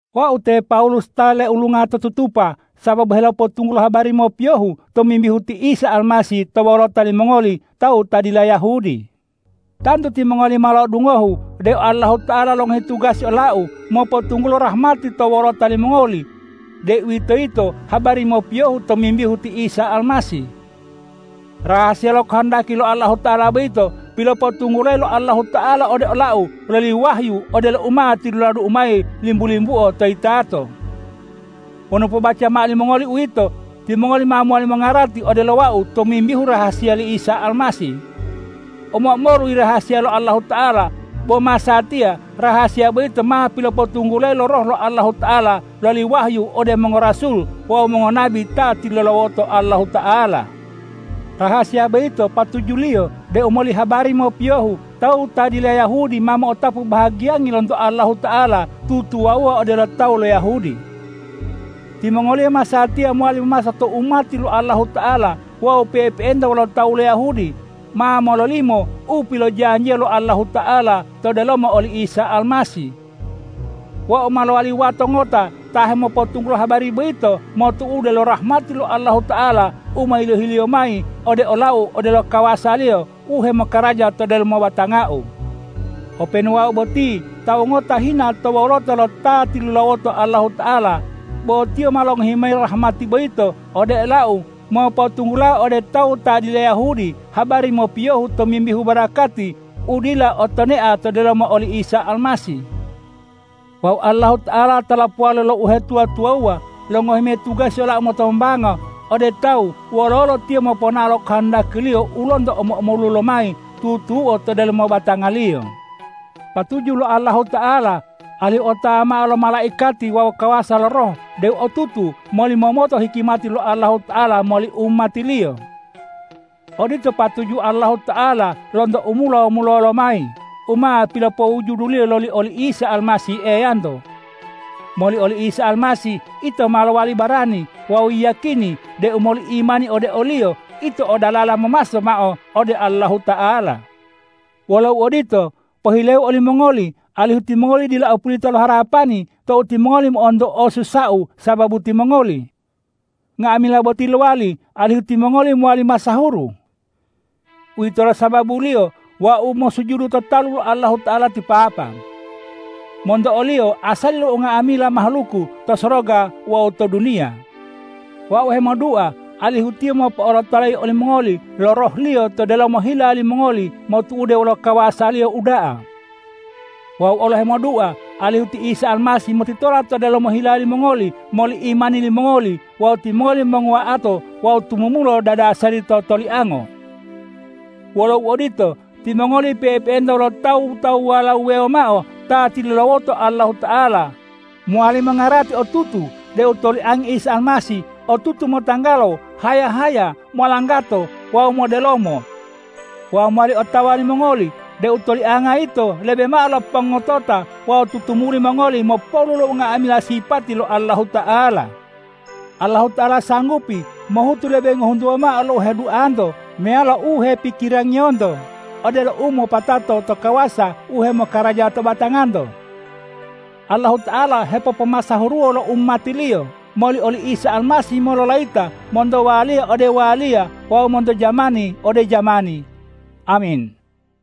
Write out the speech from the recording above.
Wau te Pawulus ta leulunga to tutupa sababu helopotunggulo habari mopiyohu tomimbihu ti Isa Almasih to wolota limongoli tawu ta dila Yahudi. Tantu timongoli ma lo'odungohu deu Allahuta'ala longohi tugasi olau mopotunggulo rahmati to wolota limongoli, deuwitoyito habari mopiyohu tomimbihu ti Isa Almasih. Rahasiya lo kohondaki lo Allahuta'ala boyito pilopotunggulayi lo Allahuta'ala ode olau loli wahyu odelo u ma tiluladu'u mayi limbu-limbuo to yitato. Wonu pobaca mao limongoli uwito, timongoli ma mowali mongarati odelo wau tomimbihu rahasiya li Isa Almasih. Omo-omolu yirahasiya lo Allahuta'ala, bo masatiya rahasiya boyito ma pilopotunggulayi lo Roh lo Allahuta'ala loli wahyu ode mongorasul wawu mongonabi ta tilulawoto Allahuta'ala. Rahasiya boyito patujuliyo deu moli habari mopiyohu tawu ta dila Yahudi ma mo'otapu bahagiyangi lonto Allahuta'ala tutuwawuwa odelo tawu lo Yahudi. Timongoliyo masatiya mowali memaso to umati lo Allahuta'ala wawu pe'epe'enta wolo tawu lo Yahudi, ma mololimo u pilojanjiya lo Allahuta'ala to delomo oli Isa Almasih. Wau ma lowali wato ngota ta hemopotunggulo habari boyito motu'ude lo rahmati lo Allahuta'ala u ma yilohi-Liyo mayi ode olau odelo kawasa-Liyo u hemokaraja to delomo batangau. Openu wau boti tawu ngota hina to wolota lo ta tilulawoto Allahuta'ala, bo Tiyo ma longohi mayi rahmati boyito ode olau mopotunggulao ode tawu ta dila Yahudi habari mopiyohu tomimbihu barakati u dila o tonea to delomo oli Isa Almasih. Wawu Allahuta'ala ta lopowali lo uhetuwa-tuwawuwa longohi mayi tugasi olau motombanga ode tawu wololo Tiyo moponao lo kohondaki-Liyo u lonto omo-omolu lomayi tutuo to delomo batanga-Liyo. Patuju lo Allahuta'ala alihu otawa mao lo malaikati wawu kawasa lo roh deu otutu molimomoto hikimati lo Allahuta'ala moli umati-Liyo. Odito patuju Allahuta'ala lonto u mulo-mulolo lomayi u ma pilopowujudu-Liyo loli oli Isa Almasih Eyanto. Moli oli Isa Almasih ito ma lowali barani wawu yiyakini deu moli imani ode o-Liyo ito o dalala momaso mao ode Allahuta'ala. Wolo uodito, pohileu olimongoli alihu timongoli dila opulita lo harapani tou timongoli mo'onto osusau sababu timongoli. Nga'amila boti lowali alihu timongoli mowali masahuru. Uwitolo sababuliyo wau mosujudu to talu lo Allahuta'ala ti Papa. Monto o-Liyo asali lo nga'amila mahaluku to soroga wawu to duniya. Wau hemodua alihu Tiyo mopo'olotolayi olimongoli lo Roh-Liyo to delomo hila limongoli motu'ude wolo kawasa-Liyo u uda'a. Wau olo hemodua alihu ti Isa Almasih motitola to delomo hila limongoli moli imani limongoli wawu timongoli monguwa'ato wawu tumumula dadasari to toliango. Wolo uodito, timongoli pe'epe'enta wolo tawu-tawuwala wuwewo mao ta tilulawoto Allahuta'ala, mowali mongarati otutu deu toliangi Isa Almasih otutu motanggalo, haya-haya, molanggato wawu modelomo wawu mowali otawa limongoli deu tolianga yito lebe mao lo pongotota wawu tutumuli mongoli mopolu lo nga'amila sipati lo Allahuta'ala. Allahuta'ala sanggupi mohutu lebe ngohuntuwa mao lo u heduanto meyalo u hepikirangiyonto odelo u mopatato to kawasa u hemokaraja to batanganto. Allahuta'ala hepopomasahuruwo lo umati-Liyo moli oli Isa Almasih mololayita monto waliya ode waliya wawu monto jamani ode jamani. Amin.